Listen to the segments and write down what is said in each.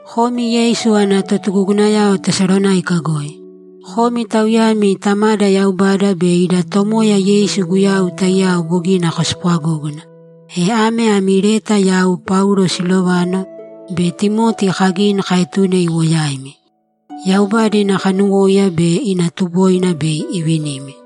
Komi Yeisu ana totugugunayao Tesalonáika goi, Komi tauyami Tamada Yaubada be ida Tomoya Yeisu Guyau taiyao bogina kospwagógana, e ame ami leta yau Paulo, Silovano, be Timoti kagini kaetune iwo yaimi. Yaubada ina kanuwóiya be ina tuboina bei ivinimi.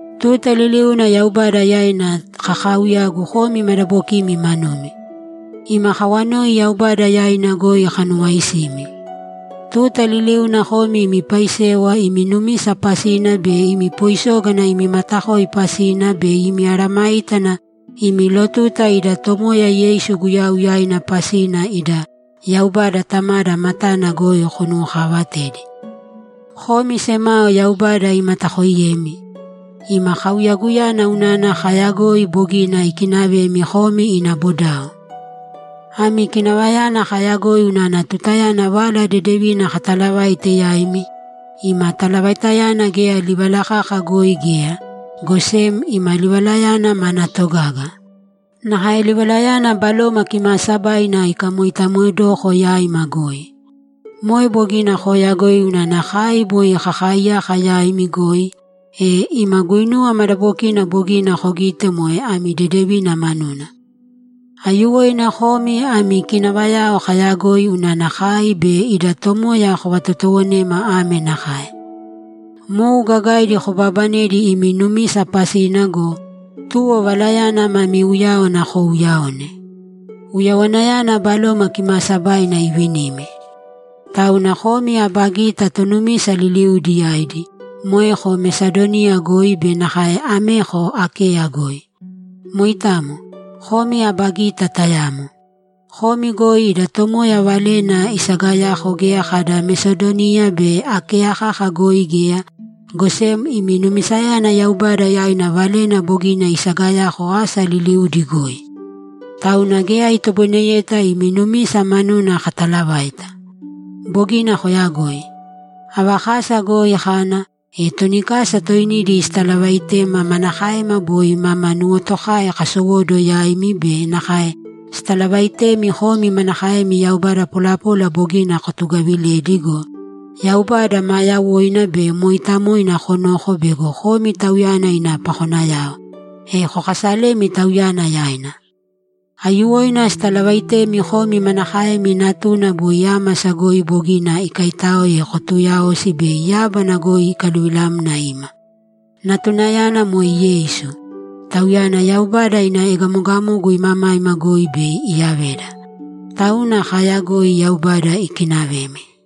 Tuta liliuna Yaubada yaina kakaauyagu komi madabokimi manumi. Ima kawanoi Yaubada yaina goi kanuwaaisimi. Tuta liliuna komi imi paisewa imi numisa pasina be imi poisógana imi matakoi pasina be imi mesayágana imi lotuta ida Tomoya Yeisu Guyau yaina pasina ida Yaubada Tamada matana goi kanuwokaavatedi. Komi semao Yaubada imatakooiyemi, ima kauyaguyana unana kaayagoi bogina ikinavemi komi ina bodao. Ami kinavayana kaayagoi unana tutayana Vala Dedevina katalavaite yaimi, ima talavaitayana geya livala kaka goi geya, go sem ima livalayana mana togaga. Nakae livalayana Baloma Kimaasabaina ikamoitamoedoko yaima goi. Moe bogina kooyagoi unana kai boi kakaaiyaka yaimi goi, e ima guinuwa madabokina bogina kogite moe ami dedevina manuna. Aiyuwoina komi ami kinavayana kaayagoi unana kai be ida Tomoya kovatotowonema ame nakae: Mou gagaidi kobaabanedi imi numisa pasina go, tuwo Valayana mami uyáwana kouuyaone. Uyawanayana Baloma Kimaasabaina ivinimi. Tauna komi aba gita tonumisa liliudi yaidi, moeko Mesadoniya goi be nakae ameko Akeya goi. Moitamo, komi aba gita tayamo. Komi goi ida Tomoya valena isagayako geya kada Mesadoniya be Akeya kaka goi geya, go sem imi numisayana Yaubada yaina valena bogina isagayako asa liliudi goi! Tauna geya itoboineyeta imi numisa manuna katalavaita. Bogina koyagoi. Ava kasa goi kana, e toni kasa toinidi sitalavaitema manakaema boi mama nuwotokai kasowóduwo yaimi be nakae sitalavaitemi komi manakaemi yaubada polapola bogina kotugaviledi go, Yaubada maa yawoina be mooitamoina konoko bego komi Tauyana ina pakonayao, e kokasalemi Tauyana yaina. Aiyuwoina sitalavaitemi komi manakaemi Natuna boi ámasa goi bogina ikaaitáoe kotuuyaosi bei yábana goi ikaluvilamna ima. Natunayana moe Yeisu; Tauyana Yaubada ina egamogamogu imamaima goi bei iyaveda. Tauna kaayagoi Yaubada ikinavemi.